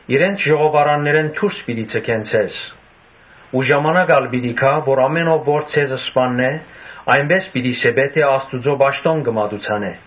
Իրենց ժողովարաններէն դուրս պիտի ձգեն ձեզ ու ժամանակ ալ պիտի գայ, որ ամէն ո՛վ որ ձեզ սպաննէ, այնպէս պիտի սեպէ թէ Աստուծոյ պաշտամունք կը մատուցանէ։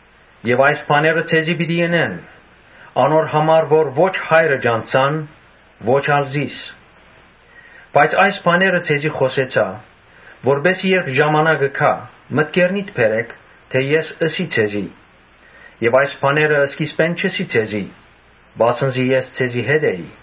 Եւ այս բաները ձեզի պիտի ընեն՝ անոր համար որ ո՛չ Հայրը ճանչցան, ո՛չ ալ՝ զիս։ Բայց այս բաները ձեզի խօսեցայ, որպէս զի երբ ժամանակը գայ, մտքերնիդ բերէք թէ ես ըսի ձեզի։ Այս բաները սկիզբէն չըսի ձեզի, վասն զի ես ձեզի հետ էի»։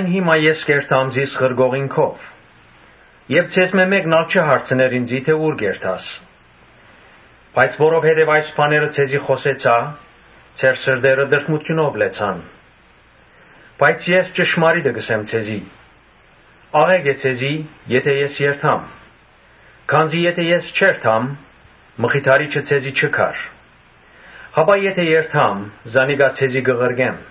«Հիմա ես կ’երթամ զիս ղրկողին քով եւ ձեզմէ մէ՛կն ալ չի հարցներ ինծի թէ ‘Ո՞ւր կ’երթաս’։ Բայց՝ որովհետեւ այս բաները ձեզի խօսեցայ, ձեր սրտերը տրտմութիւնով լեցուցան։ Բայց ես ճշմարիտը կ’ըսեմ ձեզի. ‘Աղէկ է ձեզի, եթէ ես երթամ. քանզի եթէ ես չերթամ, Մխիթարիչը ձեզի չի գար. բայց եթէ երթամ, զանիկա ձեզի պիտի ղրկեմ’։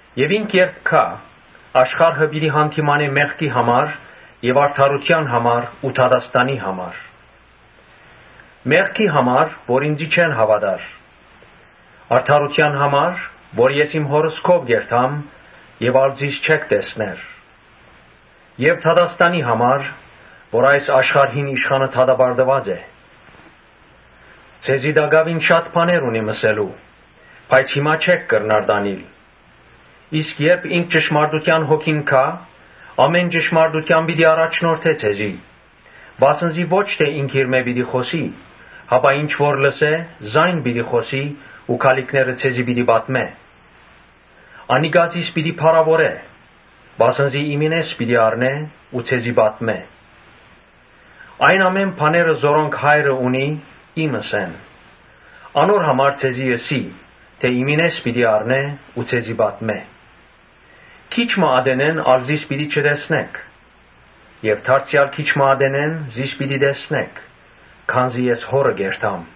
Եւ ինք երբ գայ, աշխարհը պիտի յանդիմանէ՝ մեղքի համար եւ արդարութեան համար ու դատաստանի համար։ Մեղքի համար՝ որ ինծի չեն հաւատար. Արդարութեան համար՝ որ ես իմ Հօրս քով կ’երթամ եւ ա՛լ զիս պիտի չտեսնէք. Եւ դատաստանի համար՝ որ այս աշխարհին իշխանը դատապարտուած է։ Ձեզի տակաւին շատ բաներ ունիմ ըսելու, բայց հիմա չէք կրնար տանիլ։ Իսկ երբ ինքը՝ ճշմարտութեան Հոգին՝ գայ, ամէն ճշմարտութեան պիտի առաջնորդէ ձեզ, վասն զի ո՛չ թէ ինքնիրմէ պիտի խօսի, հապա ինչ որ լսէ՝ զայն պիտի խօսի ու գալիքները ձեզի պիտի պատմէ։ Անիկա զիս պիտի փառաւորէ, վասն զի իմինէս պիտի առնէ ու ձեզի պատմէ։ Այն ամէն բաները, որոնք Հայրը ունի՝ իմս են. անոր համար ձեզի ըսի թէ իմինէս պիտի առնէ ու ձեզի պատմէ»։ «Քիչ մը ատենէն ա՛լ զիս պիտի չտեսնէք եւ դարձեալ քիչ մը ատենէն զիս պիտի տեսնէք, քանզի ես Հօրը կ’երթամ»։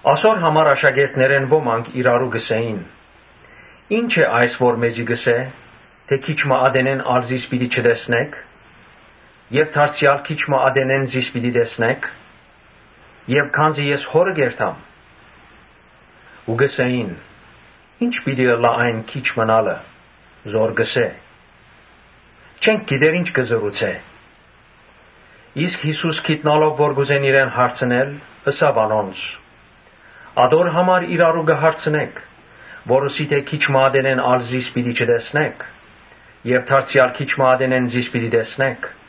Ասոր համար աշակերտներէն ոմանք իրարու կ’ըսէին. «Ի՞նչ է այս որ մեզի կ’ըսէ թէ՝ ‘Քիչ մը ատենէն ա՛լ զիս պիտի չտեսնէք եւ դարձեալ քիչ մը ատենէն զիս պիտի տեսնէք, քանզի ես Հօրը կ’երթամ’»։ Ու կ’ըսէին. «Ի՞նչ պիտի ըլլայ այն ‘Քիչ մըն ալ’ը՝ որ կ’ըսէ. չենք գիտեր ի՞նչ ըսել կ’ուզէ»։ Յիսուս իմանալով որ կ’ուզեն իրեն հարցնել, ըսաւ անոնց. «Ատո՞ր համար իրարու կը հարցնէք, որ ըսի թէ՝ ‘Քիչ մը ատենէն ա՛լ զիս պիտի չտեսնէք եւ դարձեալ քիչ մը ատենէն զիս պիտի տեսնէք’։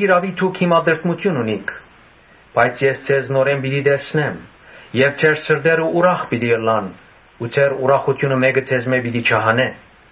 Յիրաւի հիմա դուք տրտմութիւն ունիք. բայց ես ձեզ նորէն պիտի տեսնեմ եւ ձեր սրտերը ուրախ պիտի ըլլան ու ձեր ուրախութիւնը մէ՛կը ձեզմէ պիտի չհանէ։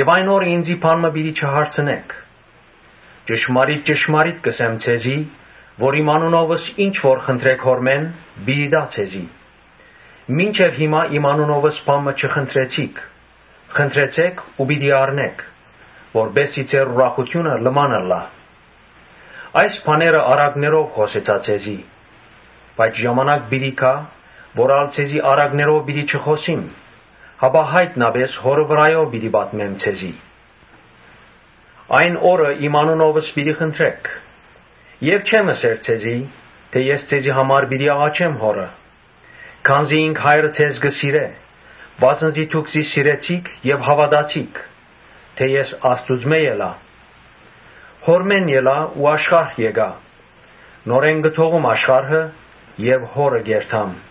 Այն օրը ինծի բան մը պիտի չհարցնէք։ Ճշմարիտ ճշմարիտ կ’ըսեմ ձեզի, թէ իմ անունովս ի՛նչ որ խնդրէք Հօրմէն, պիտի տայ ձեզի։ Մինչեւ հիմա իմ անունովս բա՛ն մը չխնդրեցիք։ Խնդրեցէք ու պիտի առնէք, որպէս զի ձեր ուրախութիւնը լման ըլլայ»։ «Այս բաները առակներով խօսեցայ ձեզի. բայց ժամանակ պիտի գայ, որ ա՛լ առակներով պիտի չխօսիմ, հապա յայտնապէս Հօրը վրայով պիտի պատմեմ ձեզի։ Այն օրը իմ անունովս պիտի խնդրէք։ Չեմ ըսեր ձեզի թէ ե՛ս ձեզի համար պիտի աղաչեմ Հօրը. Քանզի ինքը՝ Հայրը՝ ձեզ կը սիրէ, վասն զի դուք զիս սիրեցիք եւ հաւատացիք թէ ես Աստուծմէ ելայ։ Հօրմէն ելայ ու աշխարհ եկայ. նորէն կը թողում աշխարհը եւ Հօրը կ’երթամ»։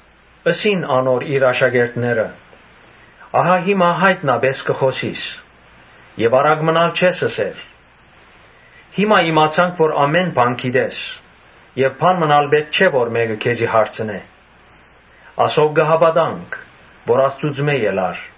Ըսին անոր իր աշակերտները. «Ահա հիմա յայտնապէս կը խօսիս եւ առակ մըն ալ չես ըսեր։ Հիմա իմացանք թէ ամէն բան գիտես եւ բա՛ն մըն ալ պէտք չէ որ մէկը քեզի հարցնէ. ասով կը հաւատանք թէ Աստուծմէ եկար»։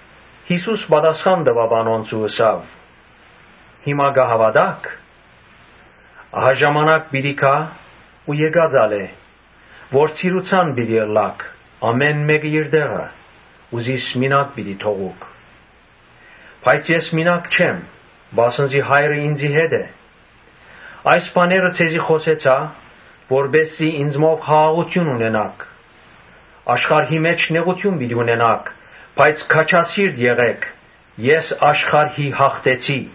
Յիսուս պատասխան տուաւ անոնց ու ըսաւ. «Հիմա կը հաւատա՞ք. Ահա ժամանակ պիտի գայ ու եկած ալ է, որ ցիրուցան պիտի ըլլաք ամէն մէկդ իր տեղը ու զիս մինակ պիտի թողուք. բայց ես մինակ չեմ, վասն զի Հայրը ինծի հետ է։ Այս բաները ձեզի խօսեցայ, որպէս զի ինծմով խաղաղութիւն ունենաք. աշխարհի մէջ նեղութիւն պիտի ունենաք, բայց քաջասի՛րտ եղէք, ես աշխարհին յաղթեցի»։